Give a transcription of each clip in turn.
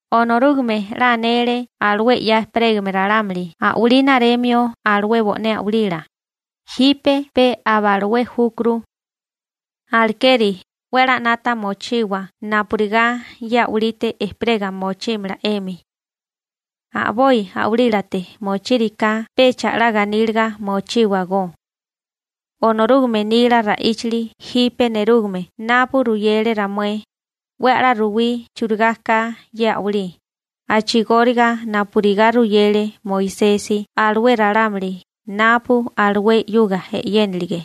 Onorúgame 'la anele alué 'ya ejperégame ralámuli a'walí naremio alué bo'né a'walila, jipe pe aba alué júkuru. Alekeri 'we a'lá 'nata mochiwa napurigá ye a'walite ejperega mochímala 'emi. A'boi a'walílate mochíriká pecha 'la ganíliga mochíwagó. Onorúgame nila ra'íchali jipe nerúgame napu ruyele ramué, 'we a'lá ruwí churigá ka ye a'walí, a'chigóriga napurigá ruyele Moisesi alué ralámuli napu alué 'yuga e'yénilige.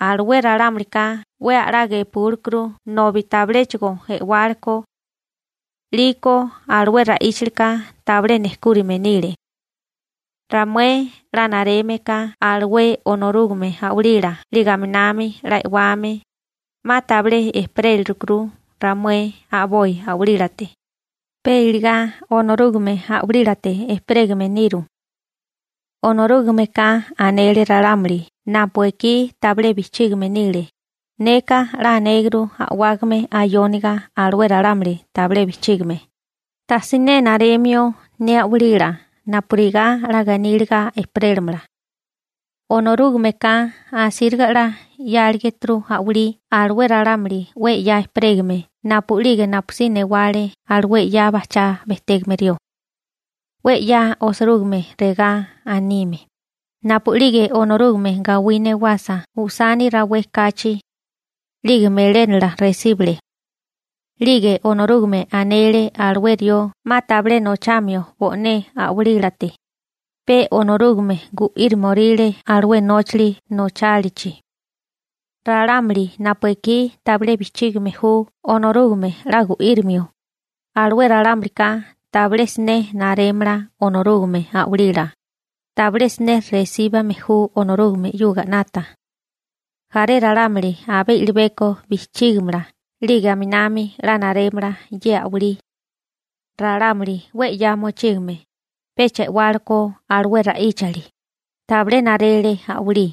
Alué ralámulika 'we a'lá gepúlekuru nobi tabiléchigo e'wálekó. 'Liko alué ra'íchalika tabilé nejkúrime nile. Ramué 'la nareme ka alué Onorúgame a'walila 'lige aminami 'la e'wame, 'ma tabilé ejperélirukuru ramué a'boi a'walílate, pe iligá Onorúgame a'walílate ejperégame niru. Onorúgameka anele ralámuli napu ekí tabilé bijchígame nile: Neka 'la anéguru a'wágame ayóniga alué ralámuli tabilé bijchígame, tajsiné naremio ne a'walila napurigá 'la ganíliga ejperélamala. Onorúgameka asíriga 'la 'yáligituru a'walí alué ralámuli 'we 'ya ejperégame napu'lige napusí newale alué 'ya bajchá bejtégame rió. 'We 'ya osirúgime regá anime: Napu'lige Onorúgame gawí newasa usani rawé kachi, 'lige melénala resíbele. 'Lige Onorúgame anele alué rió 'ma tabilé nochamio bo'né a'walílate, pe Onorúgame gu'írimoríle alué nóchali nochálichi. Ralámuli napu ekí tabilé bijchígame ju Onorúgame 'la gu'írimio, alué ralámulika tabilé siné narémala Onorúgame a'walila, tabilé siné resíbime ju Onorúgame 'yuga 'nata. Jaré ralámuli abé i'libeko bijchígimala 'lige aminami 'la narémala ye a'walí. Ralámuli 'we 'ya mochígame, pecha e'wálekó alué ra'íchali, tabilé narele a'walí.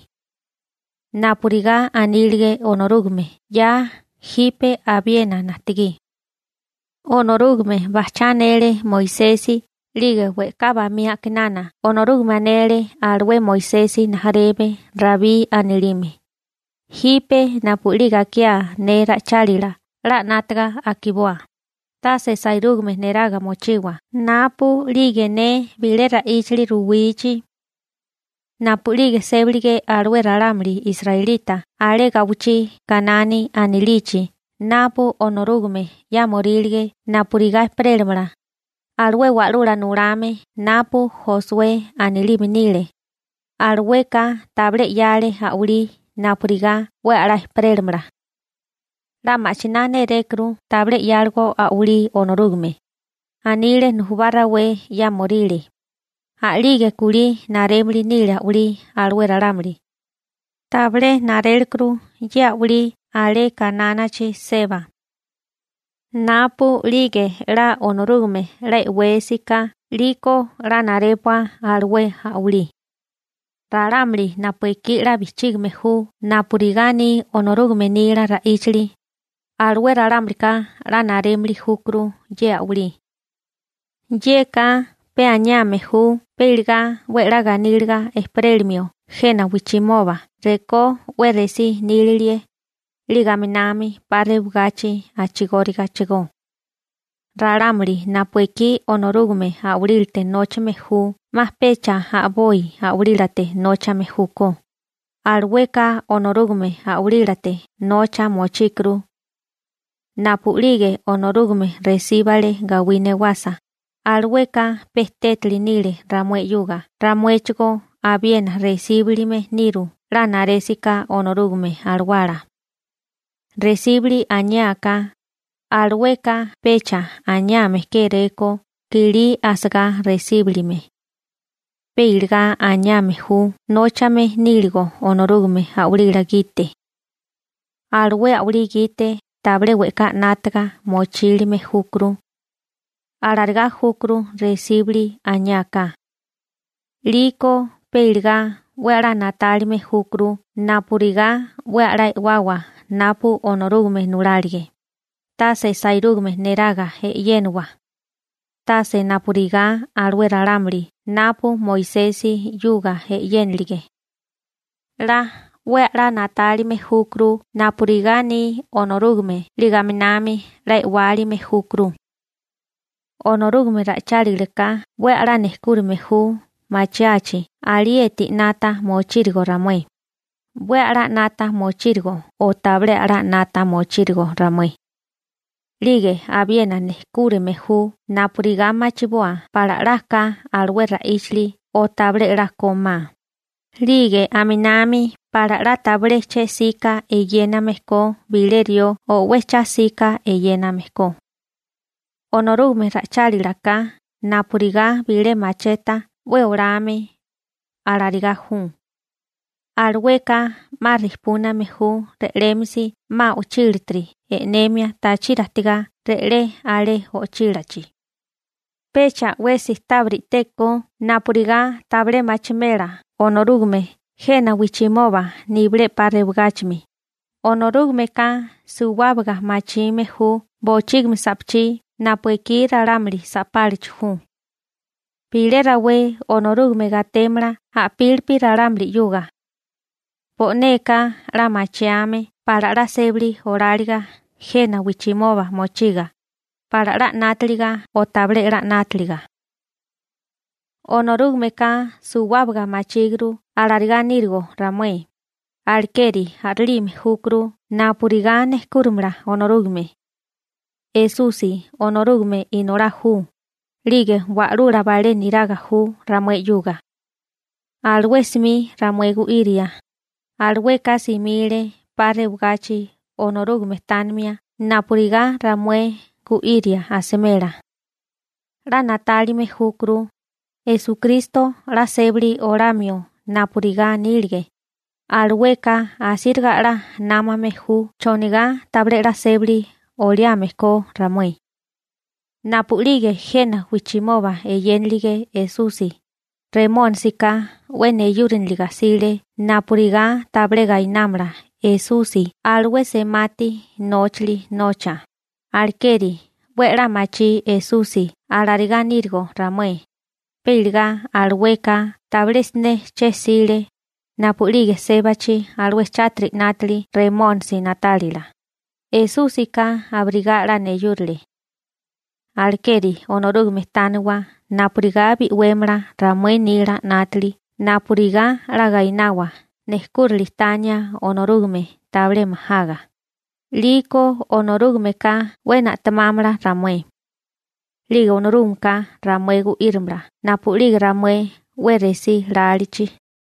Napurigá anílige Onorúgame 'ya jipe abiena najtigí. Onorúgame bajchá anele Moisesi 'lige we'ká bamí a'kinana Onorúgame anele alué Moisesi rijimala Rabí anilime: Jipe napu'lige akiá ne ra'ichálila 'la 'nátaga akiboa, tase sairúgame neraga mochiwa napu'lige ne bilé ra'íchali ruwichi. Napu'lige sébilige alué ralámuli israelita alé gawichí Kanani anilichi napu Onorúgame 'yámorílige napurigá ejperélamala, alué wa'lula nulame napu Josué anilime nile, alueka tabilé 'yale a'walí napurigá 'we a'lá ejperélamala. 'La ma'chiná nérékuru tabilé 'yáligo a'walí Onorúgame, anile nujubá rawé 'yámoríle, a'lige kulí narémili nile a'walí alué ralámuli. Tabilé narélekuru ye a'walí alé Kanánichi seba. Napu'lige 'la Onorúgame 'la e'wésigaká 'liko 'la narépua alué a'walí. Ralámuli napu ekí 'la bijchígime ju napurigá aní Onorúgame nila ra'íchali, alué ralámulika 'la narémili júkuru ye a'walí. Yeka pe aniame ju pe iligá 'we 'la ganíliga ejperélimio jena wijchimoba rekó 'we resí nílilie, 'lige aminami 'pa rewagachi a'chigórigachigó. Ralámuli napu ekí Onorúgame a'walílate nóchame ju 'ma pecha a'boi a'walílate nóchame júkó, alueka Onorúgame a'walílate nocha mochíkuru. Napu'lige Onorúgame resíbale gawí newasa, alueka pe tétali nile, ramuéchigó abiena resíbilime niru 'la narésiká Onorúgame Alawala. Resíbili aniáká, alueka pecha aniame kéréko kilí asagá resíbilime. Pe iligá aniame ju nóchame níligo Onorúgame a'walila gite. Alué a'walí gite tabilé we'ká 'nátaga mochílime júkuru. Alarigá júkuru resíbili aniáká. 'Liko pe iligá 'we a'lá na'tálime júkuru napurigá 'we a'lá e'wawa napu Onorúgame nulálige, tase sairúgame neraga e'yéniwa, tase napurigá alué ralámuli napu Moisesi 'yuga e'yénilige. 'La 'we a'lá na'tálime júkuru napurigá aní Onorúgame 'lige aminami 'la e'wálime júkuru. Onorúgame ra'ichálilaka 'we a'lá nejkúrame ju machiachi alieti 'nata mochírigo ramué, 'we a'lá 'nata mochírigo o tabilé a'lá 'nata mochírigo ramué. 'Lige abiena nejkúrame ju napurigá machiboa pala 'la ka alué ra'íchali o tabilé 'la kómá, 'lige aminami pala 'la tabilé che 'sika eyéname ko bilé rió o 'we cha 'sika eyéname ko. Onorúgame ra'ichálila ka napurigá bilé macheta 'we olame, alarigá ju, alueka 'ma rijpúname ju re'lémisi 'ma o'chílatiri e'nemia tachiri ajtigá re'lé alé o'chílachi. Pecha 'wesi tábiri i'teko napurigá tabilé machimela Onorúgame jena wijchimoba nibilé 'pa rewagáchimi, Onorúgameka suwábaga machime ju bochígimi sa'pachí napu ekí ralámuli sa'pálachi ju. Bilé rawé Onorúgame gatémala a'pílipi ralámuli 'yuga. Bo'neka 'la machiame pala 'la sébali oláliga jena wijchimoba mochiga, pala 'la 'nátaliga o tabilé 'la 'nátaliga. Onorúgameka suwábaga machíguru alarigá nírigo ramué, alekeri a'rilime júkuru napurigá nejkúrimala Onorúgame. Esusi Onorúgame Inolá ju, 'lige wa'lula balé niraga ju ramué 'yuga. Alué 'smi ramué gu'iria, alueka simile 'pa rewagachi Onorúgame tánimia napurigá ramué gu'iria asimela. 'La na'tálime júkuru, Esukristo 'la sébali olamio napurigá anílige. Alueka asíriga 'la námame ju chonigá tabilé 'la sébali oliame ko ramué. Napu'lige jena wijchimoba eyénilige Esusi, Remónisika 'we neyúriniliga 'sile napurigá tabilé gainámala Esusi alué semati nóchali nocha, alekeri 'we a'lá machí Esusi alarigá nírigo ramué, pe iligá alueka tabilé siné che 'sile, napu'lige sébachi alué chátiri 'nátili Remónisi na'tálila, Esúsika abirigá 'la neyúrale. Alekeri Onorúgame tániwa napurigá bi'wémala ramué nila 'nátili napurigá 'la gainawa nejkúrili tania Onorúgame tabilé majaga, 'liko Onorúgameka 'we na'temámala ramué. 'Lige Onorúgameka ramué gu'írimala napu'lige ramué 'we resí lálichi.